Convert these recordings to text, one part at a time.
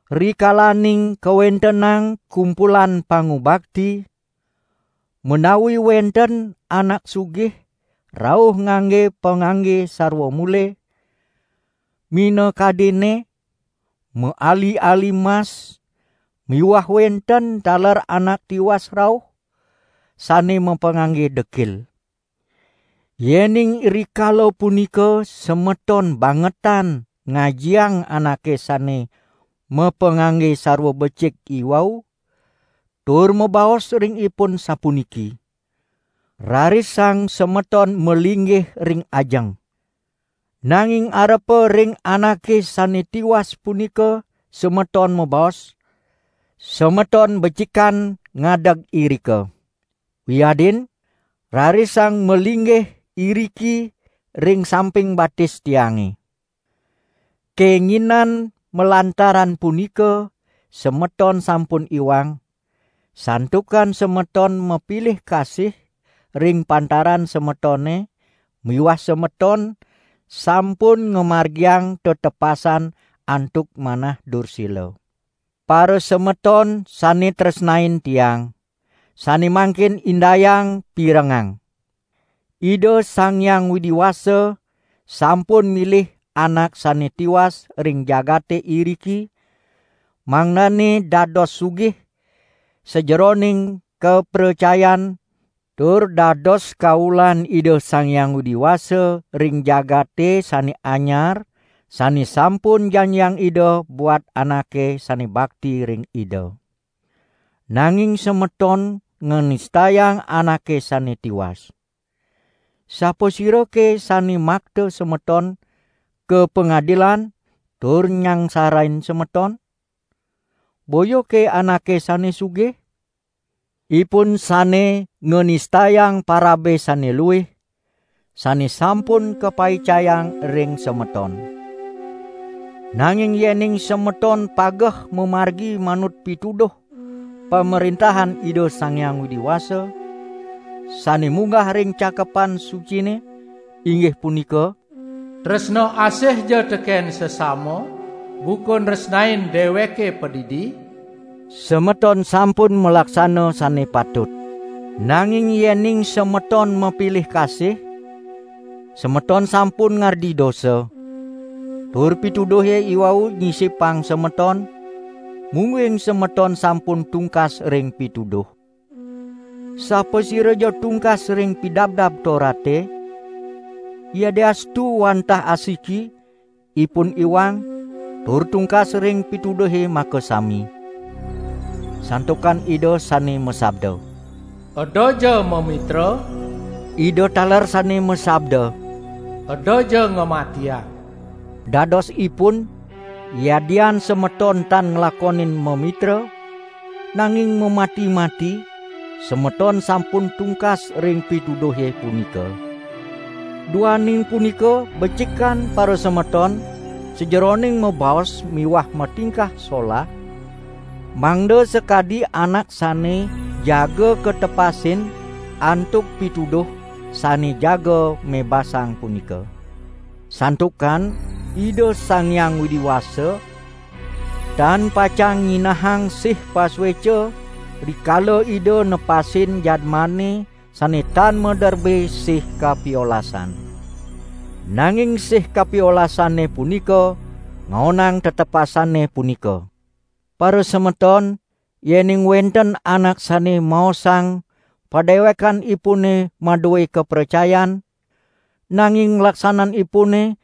Rikalaning kawentenang kumpulan pangubakti, menawi wenten anak sugih rauh ngangge pangangge sarwa mule, minakadinne: maali-ali mas miwah wenten taler anak tiwas rauh, sane mapangangge dekil. Yening rikala punika semeton bangetan ngajiang anake sane mapangangge sarwa becik iwau, tur mabaos ring ipun sapuniki: "Rarisang semeton malinggih ring ajeng," nanging arepa ring anake sane tiwas punika semeton mabaos: "Semeton becikan ngadeg irika," wiadin: "Rarisang malinggih iriki ring samping batis tiange!", kenginan malantaran punika semeton sampun iwang, santukan semeton mapilih kasih ring pantaran semetone miwah semeton sampun ngamargiang tetepasan antuk manah dursila. Parasemeton sane tresnain tiang, sane mangkin indayang pirengang! Ida Sang Hyang Widi Wasa sampun milih anak sane tiwas ring jagate iriki mangdane dados sugih sajeroning kapracayan tur dados kaulan Ida Sang Hyang Widi Wasa ring jagate sane anyar sane sampun janjiang Ida buat anake sane bakti ring Ida. Nanging semeton nganistayang anake sane tiwas. Sapasirake sane makta semeton ka pangadilan tur nyangsarain semeton? Boyake anake sane sugih? Ipun sane nganistayang parabe sane luih, sane sampun kapaicayang ring semeton. Nanging yening semeton pageh mamargi manut pituduh Pamrentahan Ida Sang Hyang Widi Wasa, sane munggah ring Cakepan Sucine, inggih punika: "Tresna asihja teken sesama buka nresnain deweke padidi," semeton sampun malaksana sane patut. Nanging yening semeton mapilih kasih, semeton sampun ngardi dosa. Tur pituduhe iwau nyisipang semeton, mungguing semeton sampun tungkas ring pituduh. Sapasiraja tungkas ring Pidabdab Torate, yadiastu wantah asiki, ipun iwang, tur tungkas ring pituduhe makasami. Santukan Ida sane masabda: "Edaja mamitra," Ida taler sane masabda: "Edaja ngamatiang." Dadosipun, yadian semeton tan nglakonin mamitra, nanging mamati-mati, semeton sampun tungkas ring pituduhe punika. Duaning punika becikan parasemeton sajeroning mabaos miwah matingkah solah, mangda sakadi anak sane jaga katepasin antuk pituduh sane jaga mebasang punika. Santukan Ida Sang Hyang Widi Wasa tan pacang nyinahang sih pasueca rikala Ida nepasin jadmane sane tan maderbe sih kapiolasan; nanging sih kapiolasane punika ngaonang tetepasane punika. Parasemeton yening wenten anak sane maosang padewekanipune madue kapracayan, nanging laksananipune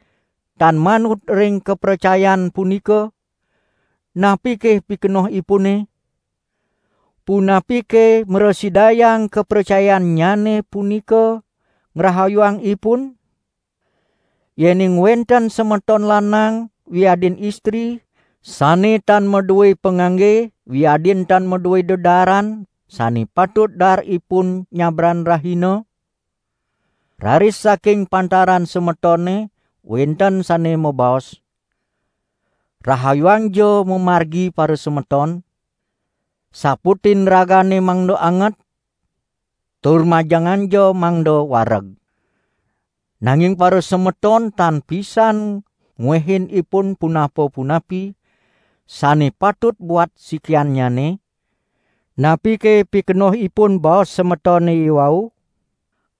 tan manut ring kapracayan punika, napike pikenohipune? Punapike mrasidayang kapracayannyane punika ngrahayuang ipun? Yening wenten semeton lanang wiadin istri sane tan madue pangangge wiadin tan madue dedaaran sane patut daar ipun nyabran rahina, raris saking pantaran semetone wenten sane mabaos: "Rahayuangja mamargi parasemeton, saputin ragane mangda anget, tur majenganja mangda wareg!" nanging parasemeton tan pisan ngwehin ipun punapa-punapi sane patut buat sikiannyane, napike pikenohipun baos semetone iwau?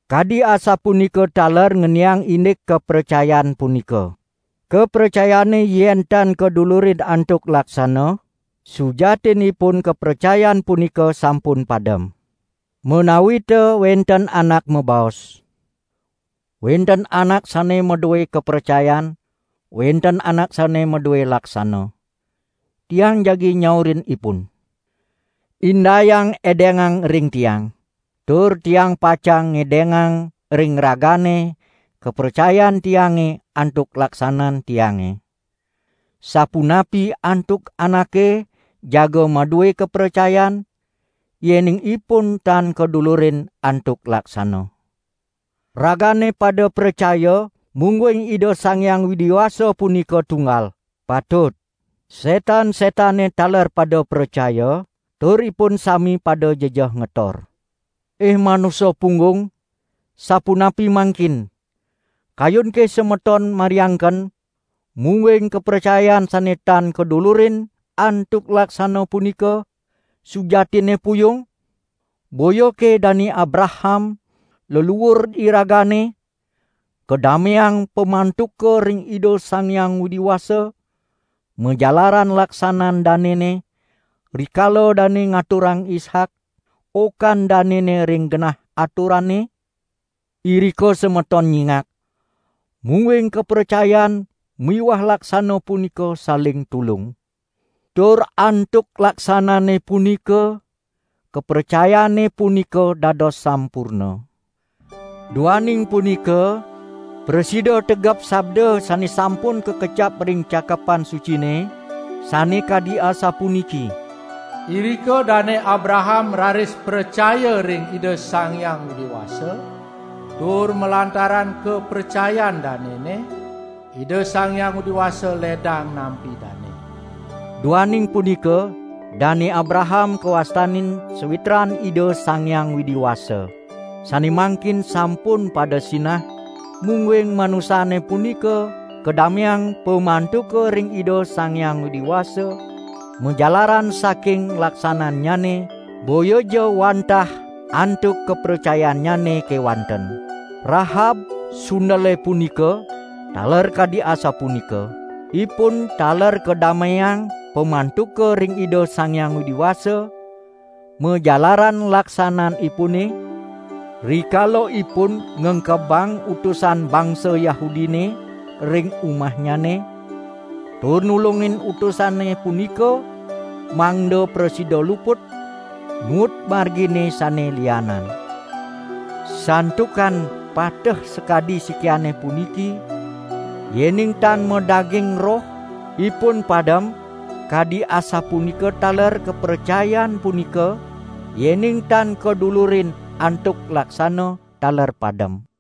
Kadi asapunika taler ngeniang indik kapracayan punika. Kapracayane yen tan kadulurin antuk laksana, sujatinipun kapracayan punika sampun padem. Menawita wenten anak mabaos: "Wenten anak sane madue kapracayan, wenten anak sane madue laksana," tiang jagi nyaurin ipun: "Indayang edengang ring tiang, tur tiang pacang ngedengang ring ragane kapracayan tiange antuk laksanan tiange." Sapunapi antuk anake jaga madue kapracayan, yening ipun tan kadulurin antuk laksana. Ragane pada pracaya mungguing Ida Sang Hyang Widi Wasa punika tunggal. Patut! Nanging setan-setane taler pada pracaya, tur ipun sami pada jejeh ngetor. Ih manusa punggung, sapunapi mangkin, kayunke semeton mariangken, mungguing kapracayan sane tan kadulurin antuk laksana punika sujatinne puyung? Boyake Dane Abraham, leluur iragane, kadameang pamantuka ring Ida Sang Hyang Widi Wasa majalaran laksanan danene, rikala dane ngaturang Ishak, okan danene ring genah aturane? Irika semeton nyingak, mungguing kapracayan miwah laksana punika saling tulung. Tur antuk laksanane punika kapracayane punika dados sampurna. Duaning punika prasida tegep sabda sane sampun kakecap ring Cakepan Sucine sane kadi asapuniki: "Irika Dane Abraham raris pracaya ring Ida Sang Hyang Widi Wasa, tur malantaran kapracayan danene, Ida Sang Hyang Widi Wasa ledang nampi dane." Duaning punika Dane Abraham kawastanin sawitran Ida Sang Hyang Widi Wasa. Sane mangkin sampun pada sinah, mungguing manusane punika kadameang pamantuka ring Ida Sang Hyang Widi Wasa majalaran saking laksanannyane, boyaja wantah antuk kapracayannyane kewanten. Rahab, sundele punika, taler kadi asapunika. Ipun taler kadameang pamantuka ring Ida Sang Hyang Widi Wasa majalaran laksananipune, rikala ipun ngengkebang utusan bangsa Yahudine ring umahnyane, tur nulungin utusane punika mangda prasida luput, nuut margine sane lianan. Santukan pateh sakadi sikiane puniki, yening tan madaging roh, ipun padem, kadi asapunika taler kapracayan punika yening tan kadulurin antuk laksana taler padem.